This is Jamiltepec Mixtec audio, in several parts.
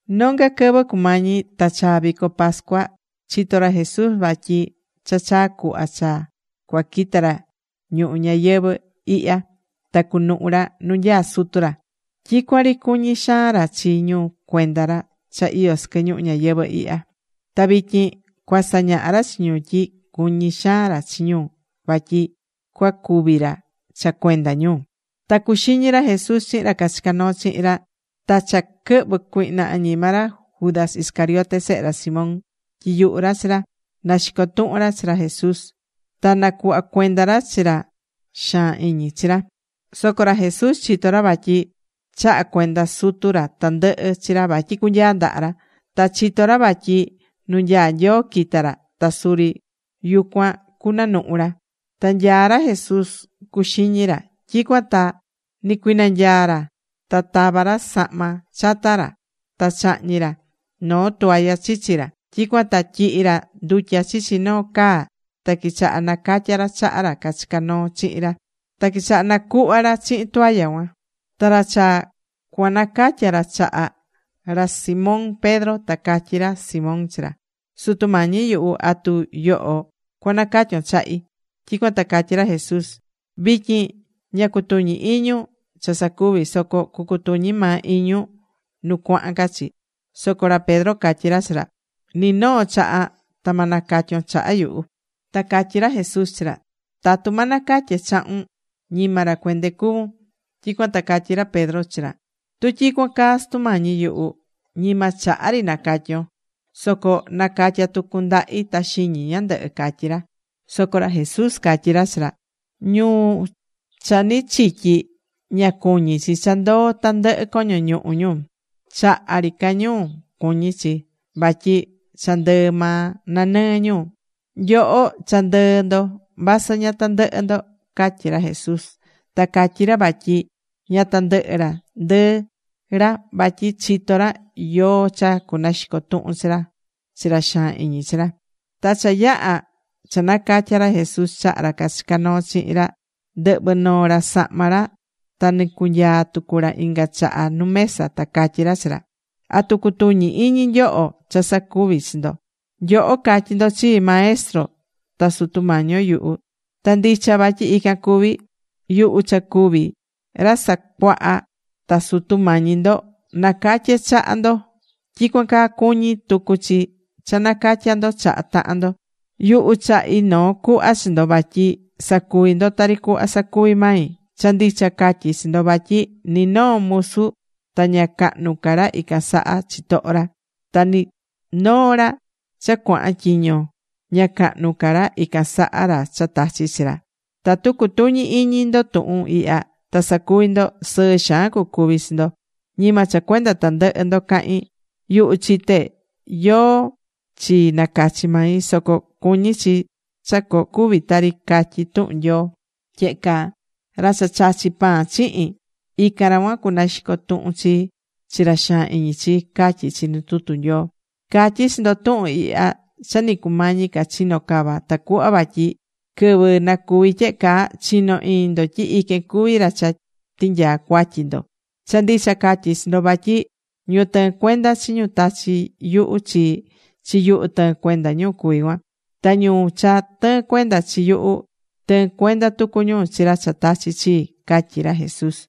Nonga quɨvɨ cumañi ta chaa vico pascua chitó ra Jesús vatyi cha chaa cuhva cha cuaquita ra ñuhu ñayɨvɨ̱ ihya ta cunuhu ra nu nyaá Sutu ra. Tyicuan ri cuñí xaan ra chi ñu cuenda ra cha iyó sɨquɨ ñuhu ñayɨvɨ̱ ihya. Ta vityin cua sañahá ra chi ñu tyi cuñí xaan ra chi ñu vatyi cuacúvi ra cha cuenda ñu. Ta cuxiñí ra Jesús chihin ra cachicá noo chihin ra. Ta cha quɨhvɨ̱ cuihna añima ra Judas Iscariote sehe ra Simón tyiyuhu̱ ra chi ra, naxico tuhun ra chi ra Jesús ta nacuhva cuenda ra chi ra chi ra xaan iñi chi ra. Soco ra Jesús chitó ra vatyi chaha̱ cuenda Sutu ra tandɨhɨ chi ra vatyi cunyaa ndaha ra. Ta chitó ra vatyi nu nyaá Nyoo quita̱ ra ta suri yucuan cunanuhu ra. Ta nyaá ra Jesús cuxiñí ra. Tyicuan ta nicuinanyaa̱ ra ta tava̱ ra sahma chata ra, ta chahñi̱ ra noo toalla chichi ra. Tyicuan ta tyihi̱ ra ndutya chichi noo caa ta quichaha nacatya ra chaha ra cachicá noo chihin ra. Ta quichaha nacuhva ra chihin toalla cuan. Ta cha cuanacatya ra chaha ra Simón Pedro ta catyí ra Simón chi ra: ―Sutu Mañi yuhu, ¿atu yoho cuanacatyon chahi? Tyicuan ta catyí ra Jesús: ―Vityin ña cutuñí iñun cha sacuví. Soco cucutuñi maa iñun nu cuahan ca chi. Soco ra Pedro catyí ra chi ra: ―Ni noo chaha ta ma nacatyon chaha yuhu. Ta catyí ra Jesús chi ra: ―Tatu ma nacatye chahun, ñima ra cuende cuvún. Tyicuan ta catyí ra Pedro chi ra Jesús: ―Tu tyicuan caa, Sutu Mañi yuhu, ñima chaha ri nacatyon, soco na̱catya tucun ndahi ta xiñi ñandɨhɨ ―catyí ra. Soco ra Jesús catyí ra chi ra: ―Ñu cha ni chityi, ña cuñí chi cha ndoo tandɨhɨ coño ñuhu ñu. Chaha ri ca ñu cuñí chi, vatyi cha ndɨɨ maa nanɨɨ ñu. Nyoho cha ndɨɨ ndo, vasɨ ña tandɨhɨ ndo ―catyí ra Jesús. Ta catyi̱ ra vatyi ña tandɨhɨ ra ndɨɨ ra vatyi chitó ra yóó cha cunaxico tuhun chi ra chi ra xaan iñi chi ra. Ta cha yaha̱ cha nacatya̱ ra Jesús chaha ra cachicá noo chihin ra, ndɨhvɨ̱ noo ra sahma ra, ta nɨcunyaa̱ tucu ra inga chaha nu mesa ta catyí ra chi ra: ―¿Atu cutuñí iñi nyoho cha sacuví chi ndo? Nyoho catyí ndo chii, Maestro ta Sutu mañí yuhu, ta ndicha vatyi ican cuví. Yuhu cha cuví Ra Sacuaha ta Sutu Mañi ndo, nacatye̱ chaha ndo, tyicuan caa cuñí tucu chi cha nacatya ndo chaha tahan ndo. Yuhu chahi̱ noo cuhva chi ndo vatyi sa̱cuvi ndo tari cuhva sacuvi̱ mai. Cha ndicha catyí chi ndo vatyi ni noo musu ta ña cahnu ca ra ican saha chitoho ra. Ta ni noo ra cha cuahan tyiño, ña cahnu ca ra ican saha ra cha tachi̱ chi ra. Tatu cutuñí iñi ndo tuhun ihya, ta sacuví ndo, sɨɨ xaan cucuví chi ndo. ’Ñima cha cuenda tandɨhɨ ndo cahín. Yuhu chité yóó chi nacachi̱ mai. Soco cuñí chi cha cucuvi tari catyí tuhun Nyoo tyehe caa: “Ra cha chachi̱ pan chihin, ican ra cuan cunaxico tuhun chii chi ra xaan iñi chii”, catyí chi nu tutu Nyoo. Catyí chi ndo tuhun ihya cha ni cumañi ca chino cava tacuhva vatyi quɨvɨ nacuvi tyehe caa, chino iñi ndo tyi iquen cuví ra cha tinyaa cuatyi ndo. Cha ndicha catyí chi ndo vatyi ñu tɨɨ́n cuenda chi ñu tachí yuhu chi, chi yuhu tɨɨ́n cuenda ñu cuví cuan. Ta ñu cha tɨɨ́n cuenda chi yuhu, tɨɨ́n cuenda tucu ñu chi ra cha tachi̱ chii ―catyí ra Jesús.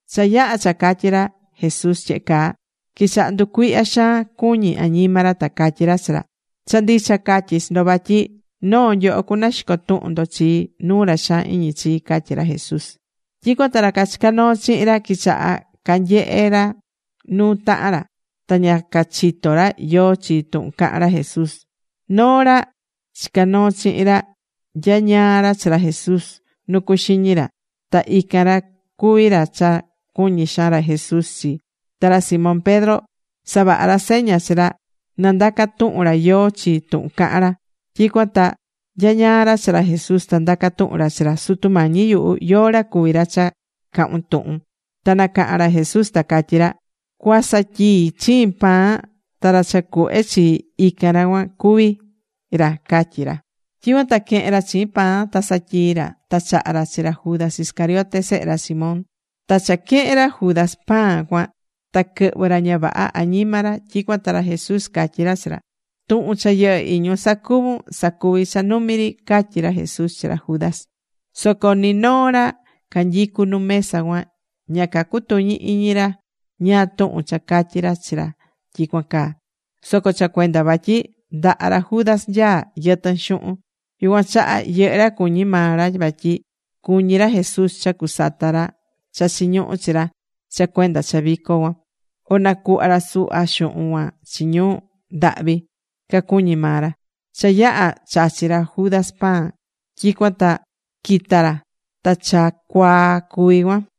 Cha yaha̱ cha catyí ra Jesús tyehe caa, quichaha̱ nducuihya xaan cuñi añima ra, ta catyí cachi ra: ―Cha ndicha catyí chi ndo, vatyi noo nyoho cunaxico tuhun ndo chii nuu ra xaan iñi chii ―catyí ra Jesús. Tyicuan ta ra cachicá noo chihin ra, quichaha̱ canyehe ra nuu tahan ra, ta ña cachitó ra yóó chi tuhun cahán ra Jesús. Noo ra chicá noo chihin ra nyañaá ra chi ra Jesús nu cuxiñí ra. Ta ican ra cuví ra cha cuñí xaan ra Jesús chi. Ta ra Simón Pedro savaha̱ ra seña chi ra, na ndaca tuhun ra yóó chi tuhun cahán ra. Tyicuan ta nyañaá ra chi ra Jesús, ta ndaca̱ tuhun ra chi ra: ―Sutu Mañi yuhu, ¿yóó ra cuví ra cha cahún tuhun? Ta nacaha̱n ra Jesús ta catyí ra: ―Cuasatyii chiin pan, ta ra cha cuhve chi, ican ra cuan cuví ra ―catyí ra. Tyicuan ta quehe̱n ra chiin pan ta satyii̱ ra, ta chaha̱ ra chi ra Judas Iscariote, sehe ra Simón. Ta cha quehe̱n ra Judas pan cuan ta quɨhvɨ̱ ra ña vaha añima ra. Tyicuan ta ra Jesús catyí ra chi ra: ―Tuhun cha yɨhɨ́ iñun sacuvun, sa̱cuvi cha numi ri ―catyí ra Jesús chi ra Judas. Soco ni noo ra canyicú nu mesa cuan, ña cacutuñí iñi ra ñáá tuhun cha catyi̱ ra chi ra tyicuan caa. Soco cha cuenda vatyi ndaha ra Judas nyaá yɨtɨn xuhun, yucuan chaha yɨhɨ́ ra cuñi̱ maa ra vatyi cuñí ra Jesús cha cusata ra cha chiñuhú chi ra cha cuenda cha vico cuan, o nacuhva ra suhva xuhun cuan chi ñu ndahvi, cacuñi̱ maa ra. Cha yaha̱ chachi̱ ra Judas pan, tyicuan ta quita̱ ra. Ta cha cuaa cuví cuan.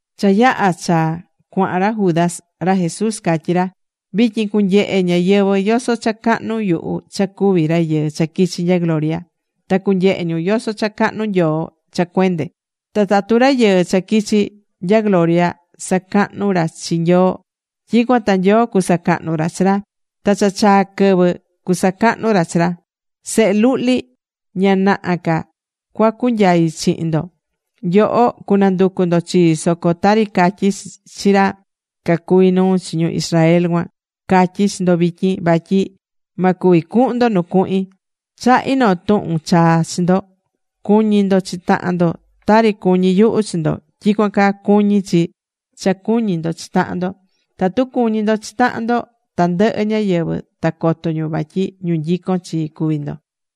Cha yaha̱ cha cuahan ra Judas, ra Jesús catyí ra: ―Vityin cunyehe ñáyɨvɨ yoso cha cahnu yuhu cha cuví Rayɨɨ cha quichi̱ nya gloria. Ta cuanyehe ñu yoso cha cahnu Nyoo cha cuende. Ta tatu Rayɨɨ cha quichi̱ nya gloria sacahnú ra chi Nyoo, tyicuan ta Nyoo cusacahnu ra chi ra. Ta cha chaa̱ quɨvɨ cuasacahnu ra chi ra. Sehe luhli, ña naha ca cuacunyai chihin ndo. Nyoho cunanducu ndo chii, soco tari catyi̱ chi ra cacuví nuu chi ñu Israel cuan, catyí chi ndo vityin, vatyi ma cuvi cuhun ndo nu cuahin. Chahí noo tuhun chaa chi ndo. Cu̱ñi ndo chi tahan ndo. Tari cuñí yuhu chi ndo, tyicuan caa cuñí chi cha cuñí ndo chi tahan ndo. Tatu cuñí ndo chi tahan ndo, tandɨhɨ ñáyɨvɨ ta coto ñu vatyi ñu nyicón chii cuví ndo.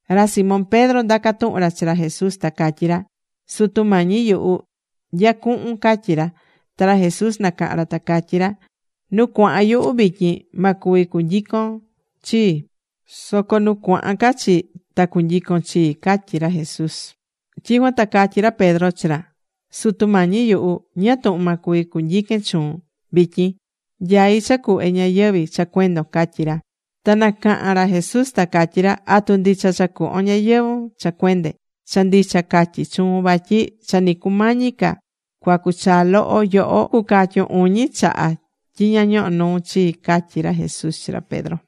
Ra Simón Pedro ndaca̱ tuhun ra chi ra Jesús ta catyí ra: ―Sutu Mañi yuhu, ¿nya cuhun? ―catyí ra. Ta ra Jesús nacaha̱n ra ta catyí ra: ―Nu cuahan yuhu, vityin ma cuvi cunyicon chii. Soco nu cuahan ca chi, ta cunyicon chii ―catyí ra Jesús. Tyicuan ta catyí ra Pedro chi ra: ―Sutu Mañi yuhu, ¿ñáá tuhun ma cuvi cunyiquen chuun vityin? Nyaí cha cuhve ñayɨvi̱ cha cuendon ―catyí ra. Ta nacaha̱n ra Jesús ta catyí ra: ―¿Atu ndicha cha cuhvon ñayɨvu̱n cha cuende? Cha ndicha catyí chuun, vatyi cha ni cumañi ca cuacu chaa loho, yoho cucatyun uñi chaha tyi ña ñohó nuun chii ―catyí ra Jesús chi ra Pedro.